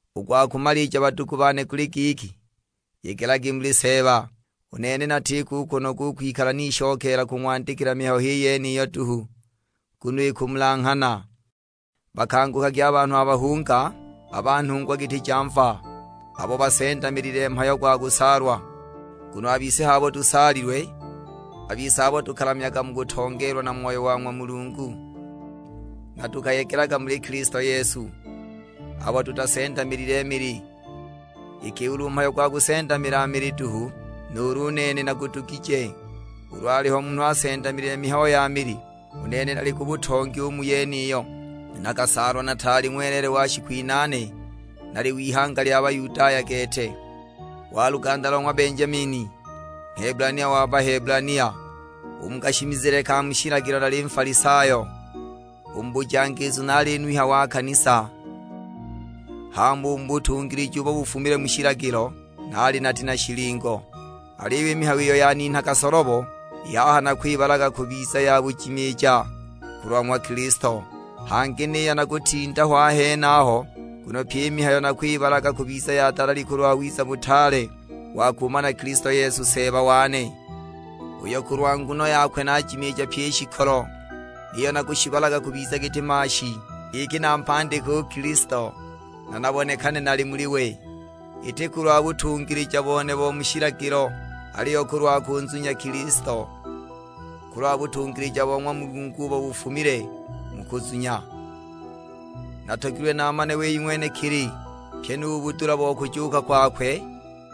U gwa kumalija badugu bane guli giki, yegelagi muli Seeba; u nene natiko u kunoga u kwikala nishokeela kung'wandikila mihayo h'i yeniyo duhu, nguno ikumulanghana. Bakangukagi a banhu a bahunga, a ba nhungwa giti ja mva, abo basendamilile mhayo gwa kusaalwa. Nguno a bise h'abo tusaalilwe, a bise abo tukalamyaga mu kutongeelwa na Moyo wa ng'wa Mulungu, na tukayegelaga muli Kilisto Yesu; abo tutasendamilile mili. Iki ulu mhayo gwa kusendamila mili duhu, nuulu u nene nagudugije; ulu aliho munhu asendamilile mihayo ya mili, u nene nali ku butongi u mu yeniyo. Nakasaalwa nataali ng'weleele wa shiku inaane, nali w'ihanga lya Bayudaya gete, wa luganda lo ng'wa Benjamini. Nghebulania wa Bahebulania, u mu kashimizile ka mu shilagilo naali Nfalisayo. U mu bujangiizu naali nuhya wa kanisa, hama u mu butungilija ubo bufumile mu shilagilo, naali nati na shilingo! Aliyo i mihayo iyo yaninhaga solobo, i haha nakwibalaga kubiza ya bujimiija kulwa ng'wa Kilisto. Hangi niyo na kutinda ho a henaho, nguno pyi i mihayo nakwibalaga kubiza ya dalali kulwa wiza butaale wa kumana Kilisto Yesu Seeba wane, uyo kulwa nguno yakwe naajimiija pyi i shikolo. Niyo nakushibalaga kubiza giti maashi, giki nampandike u Kilisto, na nabonekane nali muli we, iti kulwa butungilija bone bo mu shilagilo; aliyo kulwa kunzunya Kilisto, kulwa butungilija bo ng'wa Mulungu ubo bufumile mu kuzunya. Natogilwe naamane wei ng'wenekili, pyi nu budula bo kujuuka kwakwe,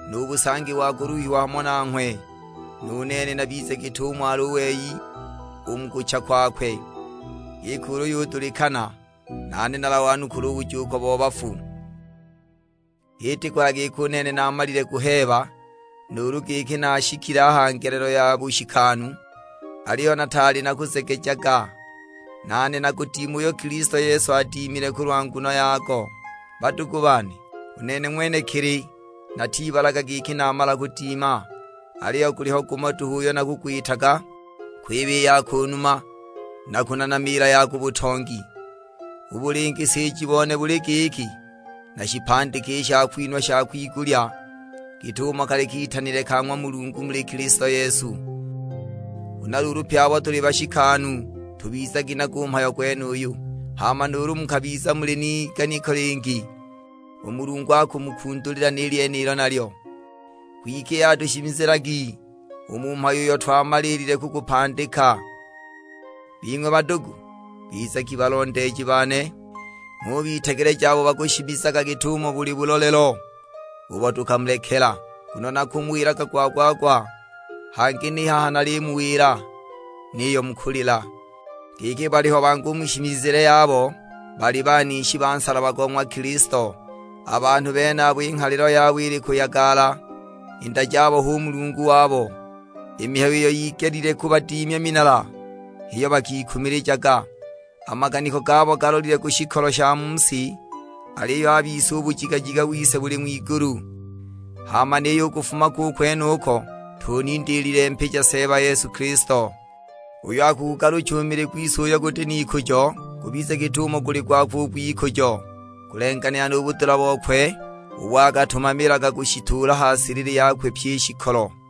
nu busangi wa kuluhiwa hamo nanghwe. Nu nene nabize git'umo ali u wei u mu kucha kwakwe; giki ulu yudulikana, nane nalawanukule u bujuuko bo bafu. H'iti kuhaya giki u nene naamalile kuheeba, nuulu giki naashikile a ha ngelelo ya bushikanu, aliyo nataali nakuzegejaga, nane nagudime uyo Kilisto Yesu anidimile kulwa nguno yago. Badugu bane, u nene ng'wenekili natibalaga giki namala kudima, aliyo guliho gumo duhu uyo nakugwitaga, kwiba i ya ku numa, na kunanamiila ya ku butongi. U bulingisiji bone buli giki nashipandike i shakwinhwa sha kwigulya, git'umo kali kitanile ka ng'wa Mulungu muli Kilisto Yesu. Huna luulu pye abo tuli bashikanu tubizagi nago u mhayo gwenuyu; hama nuulu mukabiza muli n'iganiko lingi, u Mulungu akumukundulila ni lyenilo nalyo. Kwike i haha tushimizilagi u mu mhayo uyo twamalile kugupandika. Bing'we badugu, bizagi balondeeji bane; ng'ubitegeleja abo bakushimizaga git'umo buli bulolelo ubo tukamulekela. Nguno nakumuwilaga gwa-gwa-gwa; hangi ni haha nalimuwila, niyo mu kulila, giki baliho bangi u mu shimizile yabo bali banishi ba nsalaba go ng'wa Kilisto. A banhu benabo i nghalilo yabo ili kuyagala, i nda jabo hu mulungu wabo, i mihayo iyo yigelile kubadimya minala h'iyo bakikumilijaga, a maganiko gabo galolile ku shikolo sha mu si. Aliyo a bise u bujigajiga wise buli ng'wigulu, hama niyo u kufuma ko u kwenuko, tunindiilile mpija Seeba Yesu Kilisto; uyo akugugalucha u mili gwise uyo guti n'ikujo gubize git'umo guli gwakwe u gw'ikujo, kulenganila na budula bokwe ubo akatumamilaga kushituula ha silili yakwe pyi i shikolo.